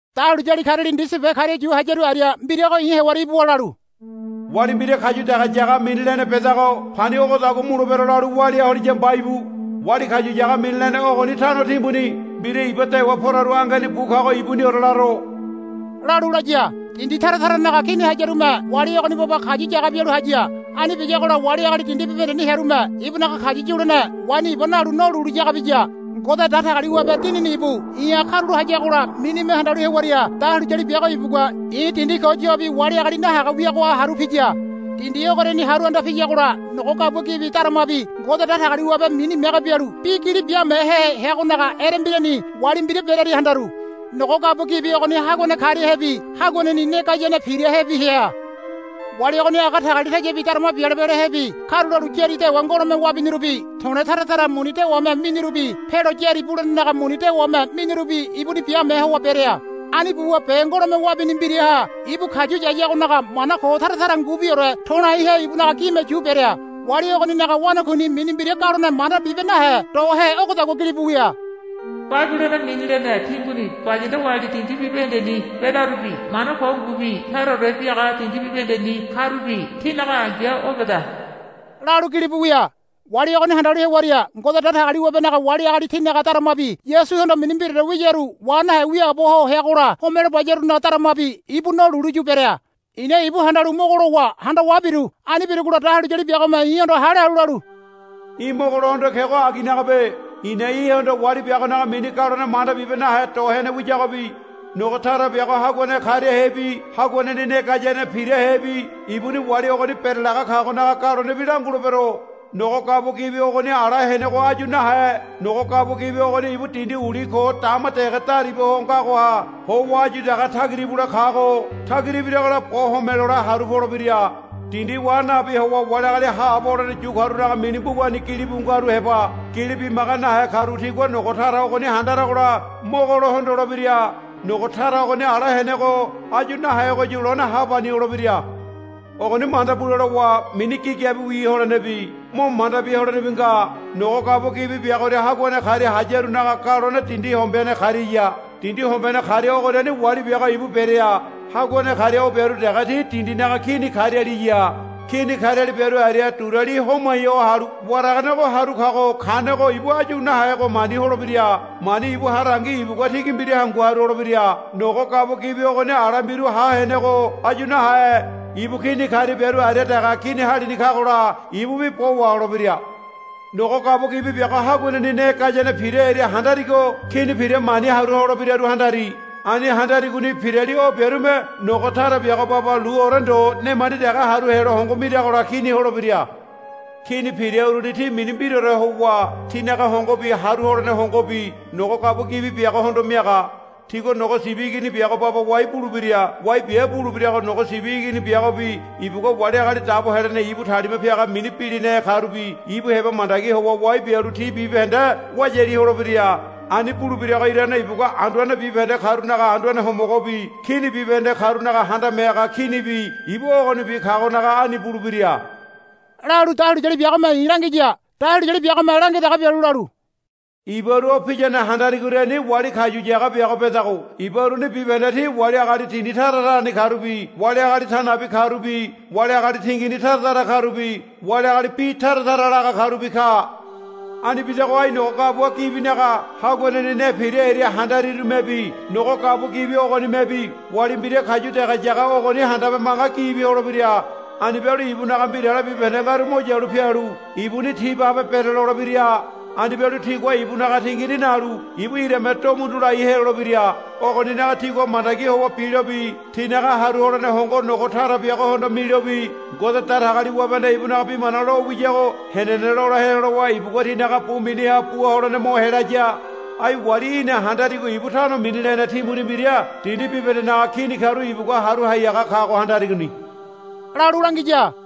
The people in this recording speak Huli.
Dahuliyali kariali ndisi be karia yu hayaru aria mbirago i̱ hewaria ibuwa lalu, Wali mbira kayu dege yaga mini lene bedago pani ogodagua mulebira lalu walia holiya mba íbu. Wali kayu yaga mini lene ogoni tano timbuni mbira iba dewa poraru angeni bu kago ibuniore laro, lalu laya. Dindi tara taranaga kini hayarume wali ogoni baba kayu yaga bialu haya. Ani biyagola wali agali dindi bibahendeni hearume ibunaga kayu yulene waini iba nalu no lulu yaga biya. Ngode Datagaliwabe Dinini ibu i̱ha karulo hayagola minime handalu hewaria dahuliyali biago ibugua i̱ dindi ko yobi wali agali nahaga wiagoha haru piya. Dindi ogoriani haru anda piyagola nogo gabua gibi daramabi Ngode Datagaliwabe mini mege bialu bi gili biamehe heagonaga erembirani wali mbira berearia handaru. Nogo gabua gibi ogoni haguane kariahebi haguaneni ne gayane pirahebi hea. Wali ogoni aga tagalitayabi darama biale bialehebi karulalu yári dewa ngolome wabinirubi to̱le̱ tara tara muni dewame minirubi pealo yári bulenaga muni dewame minirubi ibunini biame howa berea. Ani buwa be ngolome wabini mbiraha ibu kayu yayagonaga mana ko tara tara ngubiore to̱laihe ibunaga gime yu berea. Wali ogoninaga wanakuini mini mbira galone manda bibe nahe dohe ogodagua gilibu wia. Babilono mini lene timbuni bayanda wali dindi bibahendeni bedarubi mana ko ngubi taraore biaga dindi bibahendeni karubi tinaga ai̱ya o beda, lalu gilibu wia. Wali ogoni handalu hewaria Ngode Datagaliwabenaga wali agali tinaga daramabi Yasuhondo mini mbiraore wiyaru wa nahe wiaabo ho heagola homelo bayarunaga daramabi ibu no lulu yu berea. I̱na ibu handalu mogo lowa handawa biru. Ani birugola dahuliyali biagome i̱hondo hale halu lalu, Í̠ mogolohondo kego aginagabe. I̱na í̠hondo wali biagonaga mini galone manda bibe nahe do hene wiyagobi nogo tara biago haguane kariahebi haguaneni ne gayane pirahebi ibuni wali ogoni berelaga kagonaga galonebi langulebero. Nogo gabua gibi ogoni ala henego áyu nahe. Nogo gabua gibi ogoni ibu dindi uli ko dama dege dariba ho ngagoha howa áyu dege tagira ibule kago tagira ibiragola bo home lole haru polebira. Dindi wa nabi howa wali agali haabo holene yu karunaga mini mbugani gilibu ngaru heba gili bimaga nahe karu tigua nogo tara ogoni handaragola mogolo hondolebira. Nogo tara ogoni ala henego áyu nahegoyu lone hapani holebira. Ogoni manda bule lowa mini gigabiwi holenebi mo manda bia holenebi nga. Nogo gabua gibi biagoria haguane karia hayarunaga galone dindi hombene kariaya. Dindi hombene karia ogoriani wali biago ibu berea. Haguane karia o biaru dege ti dindinaga kini karialiya. Kini kariali biaru aria duriali homai ho halu waraganego haru kago kanego ibu áyu nahego mani holebira. Mani ibu harangi ibugua tigi mbira hangu haru holebira. Nogo gabua gibi ogoni ala mbiru ha henego áyu nahe. Ibu kini karia biaru aria dege kini halini kagola ibubi bo waholebira. Nogo gabua gibi biago haguaneni ne gayane pira hearia handarigo kini pira mani haru holebiraru handari. Ani handarigoni pirali o biarume nogo tara biago baba luore ndo nemandi dege haru helo hongo miragola kini holebira. Kini pira uruni ti mini mbiraore howa tinaga hongobi haru holene hongobi nogo gabua gibi biagohondo miaga. Tigua Nogo Sibi Igini biago baba wai bulebira. Wai bia bulebirago Nogo Sibi Igini biagobi ibugua wali agali dabo helene ibu talima piaga mini bilinahe karubi ibu heba mandagi howa wai bialu ti bibahende wayali holebira. Ani bulebirago irane ibugua anduane bibahende karunaga Anduane Homogobi kini bibahende karunaga Handame Haga Kinibi ibu ogonibi kagonaga ani bulebira, lalu dahuliyali biagome i̱ langiya. Dahuliyali biagome langia dege bialu lalu, Ibaru o piyane handarigoriani wali kayu yaga biago bedago iba uruni bibahende ti wali agali dindi tara tarani karubi wali agali ta nabi karubi wali agali tingini tara tara karubi wali agali bi tara tara laga karubi ka. Ani bidago ai nogo gabua gibinaga haguaneni ne pira hearia handarirumebi nogo gabua gibi ogonimebi wali mbira kayu dege yaga ogoni handabe manga gibi holebira. Ani bialu ibunaga mbirale bibahende ngaru mo yalu pialu ibuni ti babe berelolebira. Ani bialu tigua ibunaga tingini nalu ibu irame do mundu lai helolebira. Ogoninaga tigua mandagi howa bilobi tinaga haru holene hongo nogo tara biagohondo milobi Ngode Datagaliwabehanda ibunaga bi mana lo wiyago henene lola helo lowa ibugua tinaga bu miniha bua holene mo helaya. Ai wali í̠na handarigo ibu tano mini lene timbuni mbira dindi bibahendenaga kini karu ibugua haru hai haga kago handarigoni, lalu langiya.